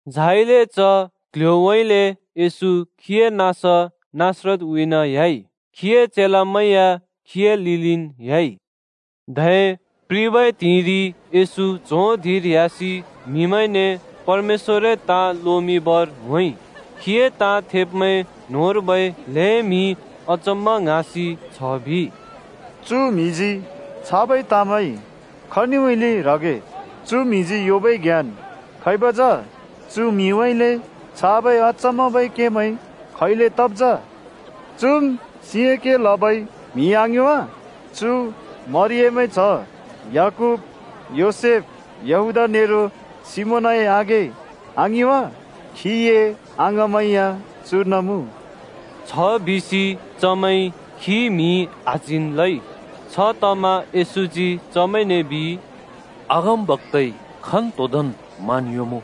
झाइले च क्‍ल्‍ह्‍योउँइँले येशू खीए नाँस नासरतउँइँन ह्‍याइ। खीए चेलामैं या खीए लिलिन् ह्‍याइ। धै प्रिबै त्हिंइरि येशू च्हों धिंर ह्‍यासि म्हिमैंने परमेश्‍वरए ताँ लोमिंबर होंइ। खीए ताँ थेब्मैं न्होंर्बै ल्हें म्हिइ अचम्‍मा ङ्हाँसि छ बिइ, “चु म्‍हिजी छाबै ताँमैं खनिउँइँले ह्रगे? चु म्‍हिजी योंबै ज्ञान खैब जा? चु म्‍हिउँइँले छाबै अचम्‍माबै केमैं खैले तब् जा? चुम् सिंए के लबै म्हि आङिं वा? चु मरियमए च्‍ह, याकूब, योसेफ, यहूदा नेरो सिमोनए आघें, आङिं वा? खीए अङाँमैं या चुर्न मुँ!” छ बिसि चमैंइ खी म्हि आच्हिन् लइ। छतमा येशूजी चमैंने बिइ, “अगमबक्‍ताइ खन्‍तोदोंन् मान योंमुँ,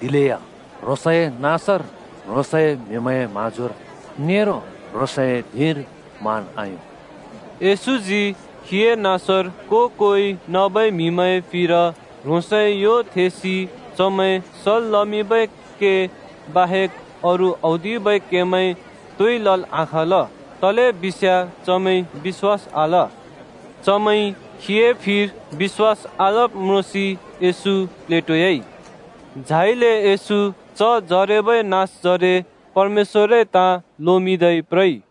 दिलेया ह्रोंसए नाँसर, ह्रोंसए म्‍हिमैंए म्‍हाँजोर, नेरो ह्रोंसए धिंर मान आयों।” येशूजी खीए नाँसर को-कोइ नबै म्‍हिमैंए फिर ह्रोंसए यो थेंसि चमैं सल् लमिंबै के बाहेक अरू औदिबै केमैं तोइ लल् आखाँल। तलेबिस्‍याँ चमैंइ बिश्‍वास आल। चमैंइ खीए फिर बिश्‍वास आलब् म्रोंसि येशू प्लेटोयाइ। झाइले येशू च जरेबै नाँसजरे परमेश्‍वरए ताँ लोमिंदै प्रइ।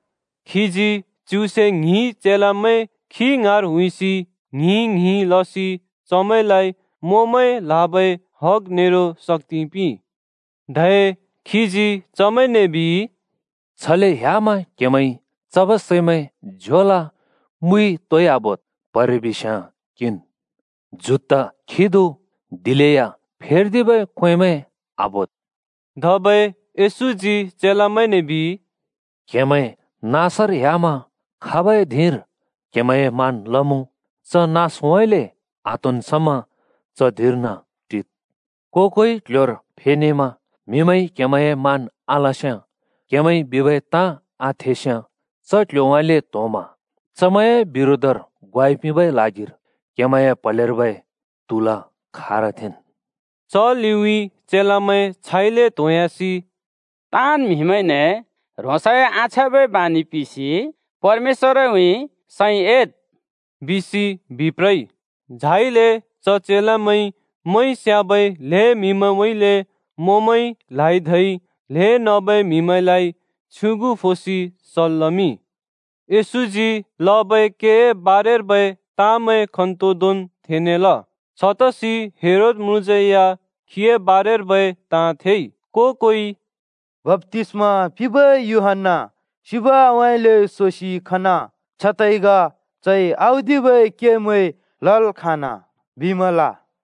खीजी च्युसे ङ्हिं चेलामैं खी ङाँर हुइसि ङ्हिं-ङ्हिं लसि चमैंलाइ मोंमैं ल्‍हाबै हग नेरो शक्‍ति पिंइ। धै खीजी चमैंने बिइ, “छले ह्‍यामा क्हेमैंइ चबै सैमैं, झ्योल, मुइ तोइ आबोद्। प्हरे बिस्याँ किंन्, जुत्ता खिदु, दिलेया फेर्दिबै क्‍वेंमैं आबोद्।” धबै येशूजी चेलामैंने बिइ, “क्‍हेमैं नाँसर ह्‍यामा खाबै धिंर क्‍हेमैंए मान् लमुँ, च नाँसउँइँले आत्‍होंन् समा च धिंर्न टिद्। को-कोइ क्‍ल्‍ह्‍योर फेनेमा म्हिमैंइ क्‍हेमैंए मान आलस्‍याँ, क्‍हेमैंइ बिबै ताँ आथेस्‍याँ, च क्‍ल्‍ह्‍योउँइँले त्‍होंमा चमैंए बिरोधर ग्वाइ पिंबै ल्हागिर क्‍हेमैंए प्‍हलेर्बै त्‍हुल खारथेंन्।” च लिउँइँ चेलामैं छाइले त्‍होंह्‍यासि “ताँन् म्‍हिमैंने ह्रोंसए आछ्याँबै बानि पिसि परमेश्‍वरउँइँ सैं एद्,” बिसि बिप्रइ। झाइले च चेलामैंइ मोंइ स्‍याबै ल्‍हें म्‍हिमैंउँइँले मोंमैं ल्‍हाइ धै ल्‍हें नबै म्‍हिमैंलाइ [प्राथना लदै] छ्युगु फोसि सल् लमिंइ। येशूजी लबै केए बारेर्बै ताँमैं खन्तोदोंन् थेनेल। छतसि हेरोद म्रुँज्यै या खीए बारेर्बै ताँ थेइ। को-कोइइ “बप्‍तिस्‍मा पिंबै यूहन्‍ना सिबउँइँले सोसि खना! छतैग चइ औदिबै केमैं लल् खाँना बिमल।”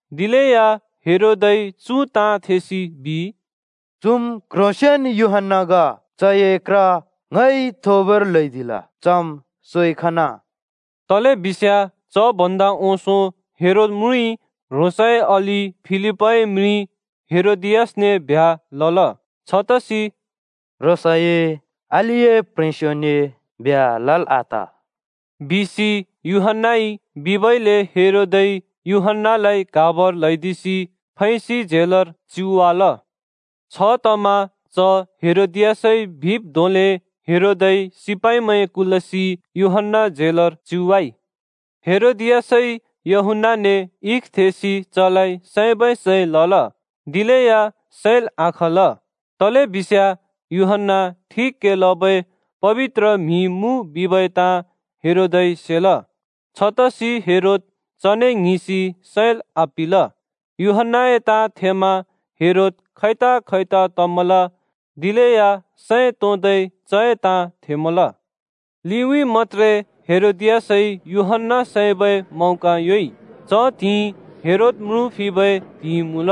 दिलेया हेरोदइ चु ताँ थेसि बिइ, “चुम् क्ह्रोंसेंन् यूहन्‍ना ग। चए क्र ङइ थोबर ल्‍हैदिल, चम् सोइ खना।” तलेबिस्याँ च भन्दा ओंसों हेरोद म्रुँइ ह्रोंसए अलि फिलिपए प्ह्रेंस्यो हेरोदियासने ब्ह्‍या लल। छतसि “ह्रोंसए अलिए प्ह्रेंस्योने ब्ह्‍या लल् आत!” बिसि यूहन्‍नाइ बिबइले हेरोदइ यूहन्‍नालाइ क्हाबर ल्हैदिसि फैसि झेलर च्युवाल। छतमा च हेरोदियासइ बिब् धोंले हेरोदइ सिपाइमैं कुलसि यूहन्‍ना झेलर च्युवाइ। हेरोदियासइ यूहन्‍नाने इख थेंसि चलाइ सैबै सैं लल, दिलेया सैल् आखाँल, तलेबिस्याँ यूहन्‍ना ठिक के लबै पबित्र म्‍हि मुँ बिबै ताँ हेरोदइ सेल। छतसि हेरोद चने ङ्हिंसि सैल् आपिंल। यूहन्‍नाए ताँ थेमा हेरोद खैताखैता तमल दिलेया सैं तोंदै चए ताँ थेमल। लिउइ मत्‍त्रे हेरोदियासइ यूहन्‍ना सैबै मौका योंइ। च त्हिंइ हेरोद म्रुँ फिबै त्हिंइ मुँल।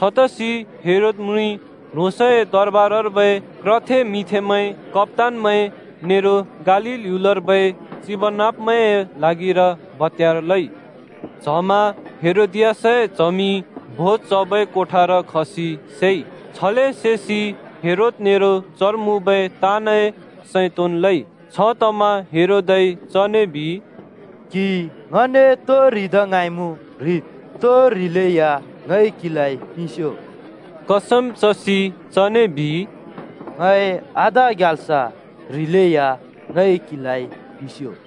छतसि हेरोद म्रुँइ ह्रोंसए दरबारर्बै क्रथे मिंथेमैं, कप्‍तानमैं नेरो गालील ह्‍युलर्बै चिबनाँब्मैंए ल्हागिर भत्यार लइ। च्हमा हेरोदियासए च्हमि भोज चबै कोठार खसि सेइ। छले सेसि हेरोद नेरो चर मुँबै ताँनए सैं तोंन् लइ। छतमा हेरोदइ चने बिइ, “क्‍हिइ ङने तो ह्रिदा ङ्हाँइमुँ ह्रिद्, तो ह्रिलेया ङइ क्‍हिलाइ पिंस्यो!” कसम चसि चने बिइ, “ङए आधा ग्याल्स ह्रिलेया ङइ क्हिलाइ पिंस्‍यो।”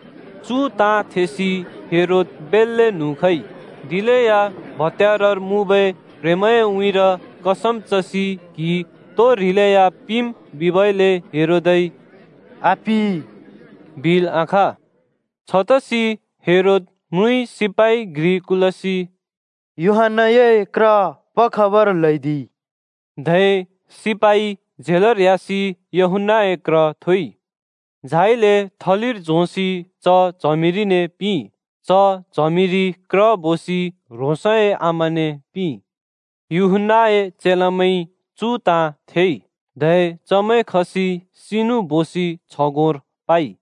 चु ताँ थेसि हेरोद बेल्‍ले न्हुँ खइ, दिलेया भत्यारर मुँबै प्ह्रेंमैंए उँइँर कसम चसि क्हिइ तो ह्रिलेया पिंम् बिबइले हेरोदइ “आपिं,” बिल् आखाँ। छतसि हेरोद म्रुँइ सिपाइ घ्रि कुलसि यूहन्‍नाए क्र पखबर ल्हैदिइ। धै सिपाइ झेलर ह्‍यासि यूहन्‍नाए क्र थोइ। झाइले थलिर झोंसि च च्हमिरिने पिंइ। च च्हमिरिइ क्र बोसि ह्रोंसए आमाने पिंइ। यूहन्‍नाए चेलामैंइ चु ताँ थेइ, धै चमैं खसि सिनु बोसि छगोंर पाइ।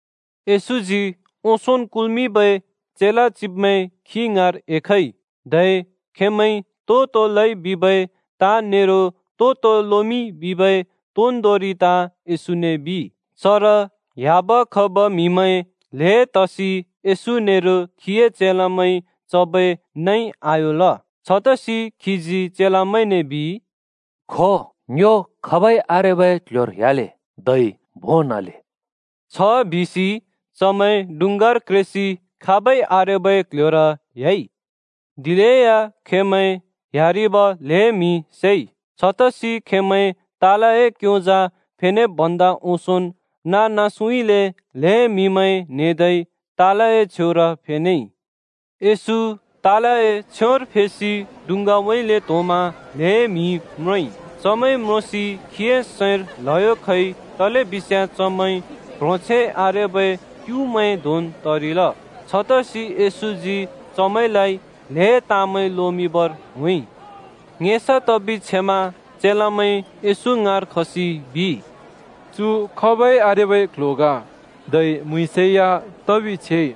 येशूजी ओंसोंन् कुल्मिंबै चेला चिब्मैं खी ङाँर एखइ। धै खेंमैंइ तो तो लइ बिबै ताँ नेरो तो तो लोमिंइ बिबै तोन्दोंरि ताँ येशूने बिइ। चर ह्‍याब खब म्‍हिमैं ल्‍हें तसि येशू नेरो खीए चेलामैंइ चबै नइ आयोंल। छतसि खीजी चेलामैंने बिइ, “खो, ङ्यो खाबै आरेबै क्‍ल्‍ह्‍योर ह्‍याले धै भों न्‍हले।” छबिसि चमैं डुँङ्गार क्रेसि खाबै आरेबै क्‍ल्‍ह्‍योर ह्‍याइ। दिलेया खेंमैं ह्‍यारिब ल्हें म्हिइ सेइ। छतसि खेंमैं तालए क्‍योंजा फेनेब् भन्दा ओंसोंन् नाँ-नाँसउँइँले ल्हें म्‍हिमैं न्हेदै तालए छेउर फेनेइ। येशू तालए छेउर फेसि डुँङ्गाउँइँले त्‍होंमा ल्हें म्हि म्रोंइ। चमैं म्रोंसि खीए सैंर ल्‍हयो खइ तलेबिस्याँ चमैं प्ह्रोंछैं आरेबै क्‍युमैं धोंन् तरिल। छतसि येशूजी चमैंलाइ ल्‍हें ताँमैं लोमिंबर होंइ। ङेसा तबि छेमा चेलामैं येशू ङाँर खसि बिइ, “चु खाबइ आरेबै क्‍ल्‍ह्‍यो ग। धै म्‍हुँइँसै या तबि छेइ।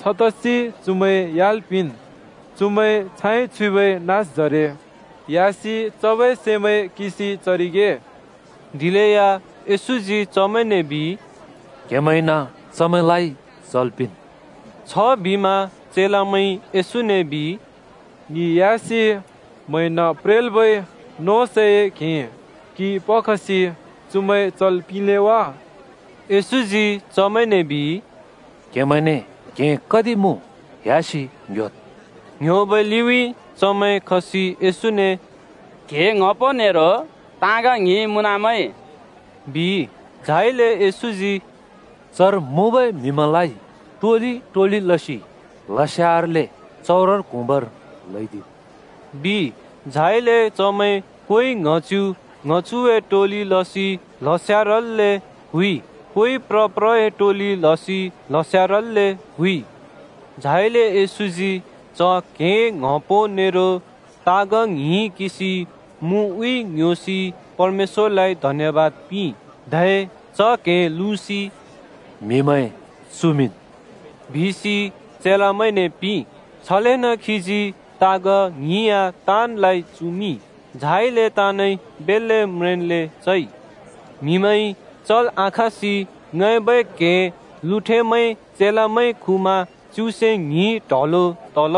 छतसि चुमैं ह्‍याल् पिंन्। चुमैं छाइ छुइबै नाँसजरे ह्‍यासि चबै सैमैं किंसि चरिगे।” दिलेया येशूजी चमैंने बिइ, “क्‍हेमैंइन चमैंलाइ चल् पिंन्।” छबिमा चेलामैंइ येशूने बिइ, “ङि ह्‍यासि म्हैंन प्रेल्बै नोंसैए क्‍हें किंइ पखसि चुमैं चल् पिंले वा?” येशूजी चमैंने बिइ, “क्‍हेमैंने कति पो क्‍हें मुँ? ह्‍यासि ङ्योद्।” ङ्ह्‍योबै लिउँइँ चमैं खसि येशूने “क्‍हें ङ्‌हपो नेरो ताँग ङ्हिं मुँनमैं,” बिइ। झाइले येशूजी “चर मुँबै म्हिमैंलाइ टोलि टोलि लसि ल्हस्यारल्‍ले चउरर क्हुँबर ल्हैदिद्,” बिइ। झाइले चमैं कोइ ङ्‍हच्यु ङ्‍हच्युए टोलि लसि ल्हस्यारल्‍ले क्हुँइ। कोइ प्र प्रए टोलि लसि ल्हस्यारल्‍ले क्हुँइ। झाइले येशूजी च क्‍हें ङ्‌हपो नेरो ताँग ङ्हिं किंसि मुउँइँ ङ्‌ह्‍योसि परमेश्‍वरलाइ धन्‍यबाद पिंइ। धै च क्‍हें लुँसि “म्हिमैं चुमिंन्,” बिसि चेलामैंने पिंइ। छलेन खीजी ताँग ङ्हिं या ताँनलाइ चुमिंइ। झाइले ताँनइ बेल्‍ले म्रेंन्ले चइ। म्हिमैंइ चल् आखाँसि ङैबै क्हें लुँठेमैं चेलामैंइ खुमा च्युसे ङ्हिं ट्हलो तल।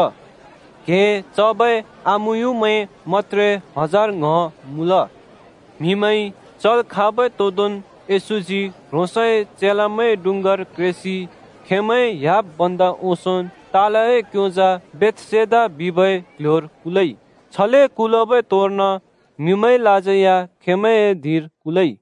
क्‍हें चबै आमुयुँमैं मत्‍त्रे हजार ङ्‌ह मुँल। म्हिमैंइ चल् खाँबै तोदोंन् येशूजी ह्रोंसए चेलामैं डुँङ्गार क्रेसि खेंमैं ह्‍याब् भन्दा ओंसोंन् तालए क्‍योंजा बेथसेदा बिबै क्‍ल्‍ह्‍योर कुलइ। छले कुलबै तोंर्न म्हिमैंलाज्यै या खेंमैंए धिंर कुलइ।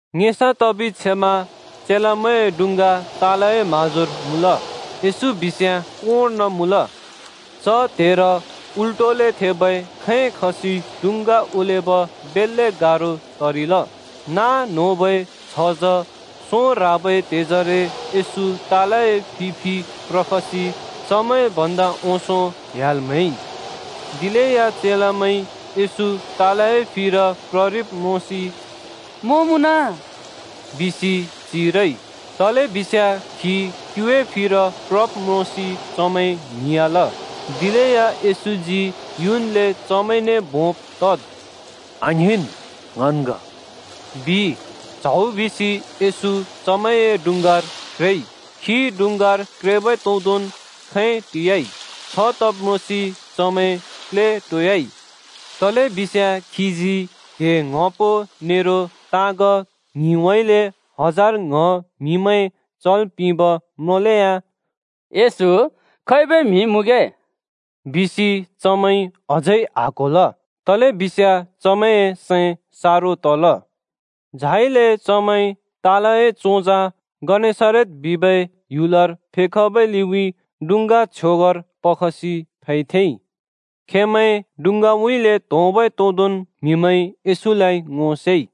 ङेसा तबि छेमा चेलामैंए डुँङ्गा तालए म्‍हाँजोर मुँल। येशू बिस्याँ कोंर्न मुँल। च त्हेर उल्टोले थेबै खैं खसि डुङ्गा ओलेब बेल्‍ले गारो तरिल। नाँ न्होबै छझँ, सों ह्राबै त्हेजरे येशू तालए फि फि प्रखसि चेमैं भन्दा ओंसों ह्‍याल् म्हैइ। दिलेया चेलामैंइ येशू तालए फिर प्ररिब् म्रोंसि “मों मुँन!” बिसि चिरइ। तलेबिस्याँ खी क्युए फिर प्रब् म्रोंसि चमैं ङ्हिंयाँल। दिलेया येशूजी युन्ले चमैंने भोंब तद्, “आङ्हिंन्! ङन् ग,” बिइ। च्हौ बिसि येशू चमैंए डुँङ्गार क्रेइ। खी डुँङ्गार क्रेबै तोदोंन् खैं टियाइ। छ तब् म्रोंसि चमैं प्लेटोयाइ, तलेबिस्याँ खीजी क्‍हें ङ्‍हपो नेरो ताँग ङ्हिंउँइँले हजार ङ्‌ह म्हिमैं चल् पिंब म्रोंलेया “येशू खैबै म्हि मुँगे” बिसि चमैंइ अझै आक्‍होल, तलेबिस्याँ चमैंए सैं सारो तल। झाइले चमैं तालए चोंजा गनेसरत बिबै ह्‍युलर फेखबै लिउँइँ डुँङ्गा छ्योगर पखसि फैथेंइ। खेंमैं डुँङ्गाउँइँले त्‍होंबै तोदोंन् म्‍हिमैंइ येशूलाइ ङो सेइ।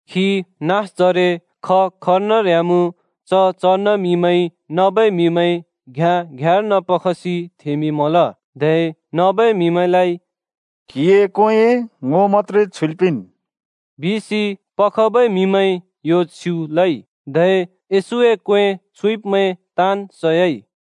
खी नाँसजरे ख-खनर ह्‍यामुँ च-चर्न म्‍हिमैंइ नबै म्‍हिमैं घ्याँ-घ्याँर्न पखसि थेंमिंमल, धै “क्‍हिए क्वेंए ङो मत्‍त्रे छुइल् पिंन्” बिसि नबै म्हिमैंइ येशूने यो छ्युँ लइ, धै येशूए क्‍वें छुइब्मैं ताँन् सयाइ।